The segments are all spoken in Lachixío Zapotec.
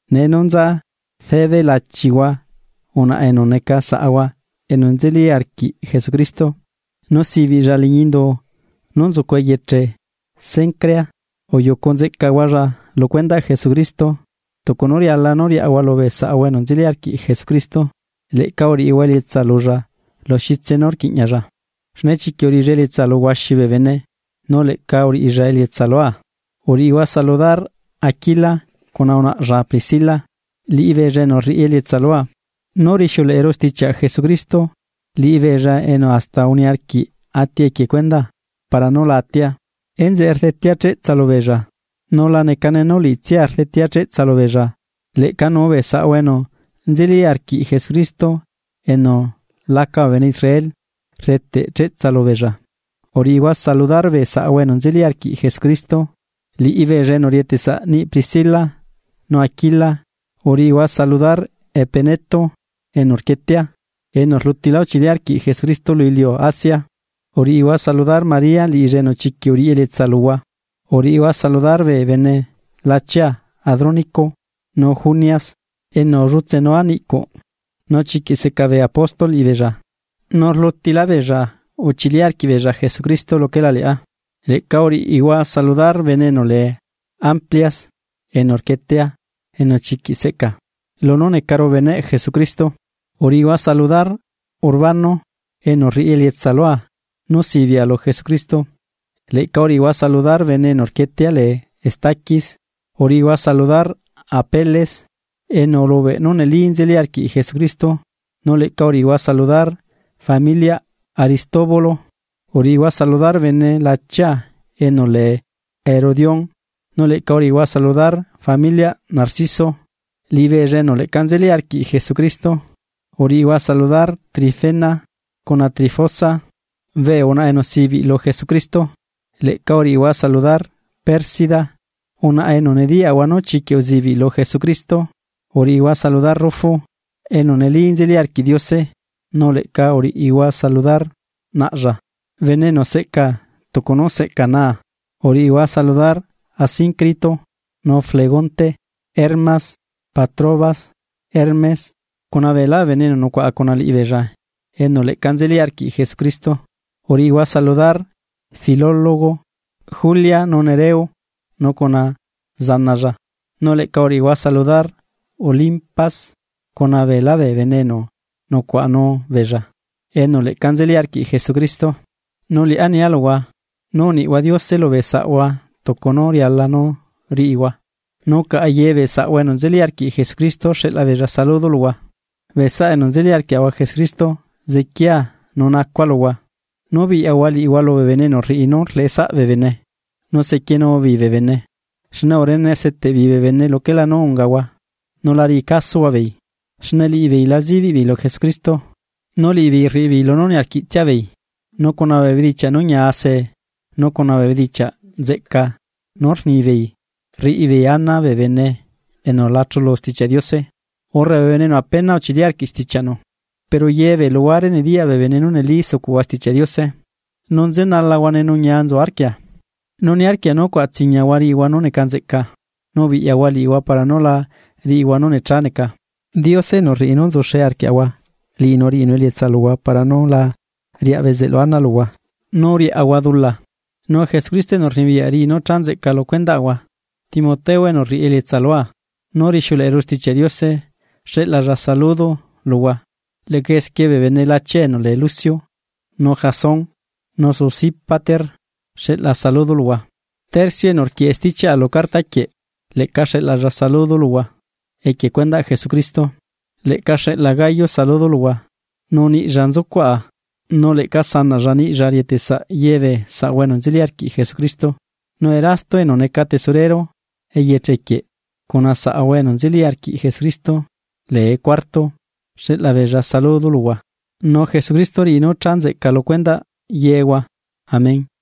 Nee nú nza Febe lachihua unaꞌa enu neca saꞌahua enu nzeli arquiꞌ Jesucristo, nu sibiꞌlla liꞌñi Indu nú nzucu eyeche Cencrea. Uyucu nzeꞌcahualla lu cuendaꞌ Jesucristo, tucu nú riala nú riaꞌahua lubee saꞌahua enu nzeli arquiꞌ Jesucristo. Leꞌca uriꞌihua elietsa lulla lu xitse nú rquiꞌñalla, xne chiquiꞌ uriꞌilla elietsa lu huaxi bee bene nu leꞌca uriꞌilla elietsa lua. Uriꞌihua saludar Aquila cuna unaꞌlla Priscila, liꞌibeella enu rriꞌi elietsa lua, nú rixiuleꞌeru stichiaꞌ Jesucristo. Liꞌibeella enu hasta uniarquiꞌ ati equie cuendaa para nú la atia, enzeꞌe rdetea cheꞌtsa lubeella. Nu la necane nú liꞌitsia rdetea cheꞌtsa lubeella. Leꞌcanu bee saꞌahua enu nzeli arquiꞌ Jesucristo enu laca bee bene Israel rdeteꞌ cheꞌtsa lubeella. Uriꞌihua saludar bee saꞌahua enu nzeli arquiꞌ Jesucristo, liꞌibeella enu rieteꞌsaꞌ niꞌi Priscila nu Aquila uriꞌihua saludar Epeneto enu rquietea, enu rlutilá uchili arquiꞌ Jesucristo lu iliu Asia. Uriꞌihua saludar María, liꞌilla enu chiquiꞌ uriꞌi elietsa luhua. Uriꞌihua saludar bee bene lachia Adrónico nu Junias, enu ullutsenua niꞌcuꞌ. Nu chiquiꞌ seca bee Apóstol liꞌibeella, nu rlutilá beella uchili arquiꞌbeella Jesucristo luquela liꞌá. Leꞌca uriꞌihua saludar bene enu lee Amplias enu rquietea enu chiquiꞌ seꞌca, lunú necaru beneꞌ Jesucristo. Uriꞌihua saludar Urbano enu rriꞌi elietsa lua nú sibiꞌa lu Jesucristo. Leꞌca uriꞌihua saludar bene enu rquietea lee Estaquis. Uriꞌihua saludar Apeles enu ulubeꞌ nú neli nzeli arquiꞌ Jesucristo, nu leꞌca uriꞌihua saludar familiaꞌ Aristóbulo. Uriꞌihua saludar bene lachia enu lee Herodión, nu leꞌca uriꞌihua saludar familiaꞌ Narciso, liꞌibeella enu leꞌca nzeli arquiꞌ Jesucristo. Uriꞌihua saludar Trifena cuna Trifosa, bee unaꞌa enu sibiꞌ lu Jesucristo. Leꞌca uriꞌihua saludar Pérsida, unaꞌa enu nediyaꞌahua nú chiquiꞌ uzibiꞌ lu Jesucristo. Uriꞌihua saludar Rufu, enu neli nzeli arquiꞌ Diose nu leꞌca uriꞌihua saludar naꞌlla, bene enu seꞌcaa tucu nú seꞌcaa naa. Uriꞌihua saludar Asíncrito, nu Flegonte, Hermas, Patrobas, Hermes cuna beelá bee bene enu nucuaꞌa cuna liꞌibeella enu leꞌca nzeli arquiꞌ Jesucristo. Uriꞌihua saludar Filólogo, Julia nu Nereo nu cuna zanalla, nu leꞌca uriꞌihua saludar Olimpas cuna beelá bee bene enu nucuaꞌanu beella, enu leꞌca nzeli arquiꞌ Jesucristo. Nu liꞌá nia luhua: Nú uniꞌhua Diose lubee saꞌhua tucu nú riala nú riꞌihua, nu caꞌa yebee saꞌahua enu nzeli arquiꞌ Jesucristo xeꞌlabeella saludo luhua. Bee saꞌa enu nzeli arquiaꞌahua Jesucristo zequiaa nu nacua luhua, nú biꞌyahua liꞌihua lubee bene enu rriꞌi nú rleꞌesaꞌa bee bene, nu sequienubeei bee bene. Xne urene seteꞌbeei bee bene luquelá nú ungahua nu la riꞌicasohua beei. Xne liꞌibeei la zibiꞌbeei lu Jesucristo, nu liꞌibeei rriꞌibeei lunú niarquiꞌtsiabeei, nu cuna bee bedichiaꞌ nú ñiase nu cuna bee bedichiaꞌ nzeꞌca nú rnibeei rriꞌibeei ana bee bene enu la chulu Stichiaꞌ Diose, urre bee bene enu apena uchili arquiꞌ stichianu. Pero yebee luhuare nediyaꞌ bee bene nú neli sucuꞌhua Stichiaꞌ Diose nu nzenalahuane nu ñia nzu arquia, nu niarquia nú cuaꞌatsiñahua riꞌihua nú neca nzeꞌca nu ubiꞌyahua liꞌihua para nú la riꞌihua nú necha neca. Diose enu rriꞌi nú nzuxe arquiaꞌahua liꞌinu riꞌinu elietsa luhua para nú la riaꞌ bezeꞌlu ana luhua nú riaꞌahua dula nu Jesucristo enu rnibiyaꞌ riꞌi nú cha nzeꞌca lu cuendaꞌahua. Timoteo enu rriꞌi elietsa lua, nú rixiuleꞌeru Stichiaꞌ Diose xeꞌlalla saludo luhua, leꞌca esquie bee bene lachia enu lee Lucio, nu Jasón, nu Sosípater xeꞌla saludo luhua. Tercio enu rquieꞌe stichiaꞌa lu carta quieꞌ leꞌca xeꞌlalla saludo luhua equie cuendaꞌ Jesucristo. Leꞌca xeꞌla Gayo saludo luhua, nu niꞌlla nzucuaꞌa nu leꞌca sanaꞌlla niꞌlla rieteꞌsaꞌ ye bee saꞌahua enu nzeli arquiꞌ Jesucristo. Nu Erasto enu neca Tesorero eyeche quieꞌ cuna saꞌahua enu nzeli arquiꞌ Jesucristo lee Cuarto xeꞌlabeella saludo luhua. Nu Jesucristo riꞌi nú cha nzeꞌca lu cuendaꞌ yehua. Amén.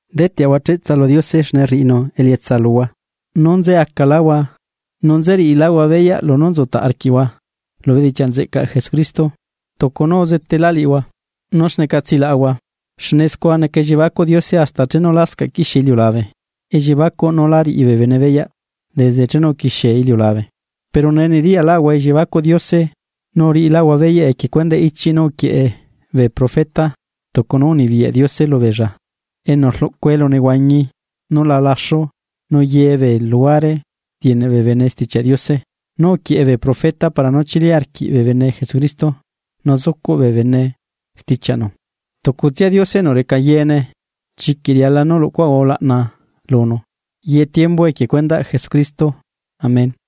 Deteꞌahua cheꞌtsa lu Diose xne rriꞌinu elietsa luhua, nú nze acaláhua nu nzeriꞌiláhua beyaꞌ lunú nzutaꞌ arquiꞌhua lu bedichiaꞌ nzeꞌcaꞌ Jesucristo, tucu nú uzetela liꞌihua nú xneca tsilaꞌahua, xne scua neca elliebacuꞌ Diose hasta chenu lascaꞌ quixie iliulabe, elliebacuꞌ nú lá riꞌi bee bene beyaꞌ desde chenu uquixie iliulabe. Pero nee nediyaꞌlaꞌahua elliebacuꞌ Diose nu uriꞌilaꞌahua beyaꞌ equie cuendaꞌ ichiꞌ nú uquieꞌe bee profeta tucu nú unibiyaꞌ Diose lubeella enu rluꞌcu elunehuañi nú la laxu nu ye bee luhuare rieneꞌ bee bene Stichiaꞌ Diose, nú uquieꞌe bee profeta para nú chili arquiꞌ bee bene Jesucristo nu zucuꞌ bee bene stichiaꞌnu. Tucutsia Diose enu reca yeene. ¡Chiquiꞌ riala nú luꞌcuaꞌahua ulaꞌna lunu, ye tiembu equie cuendaꞌ Jesucristo! Amén.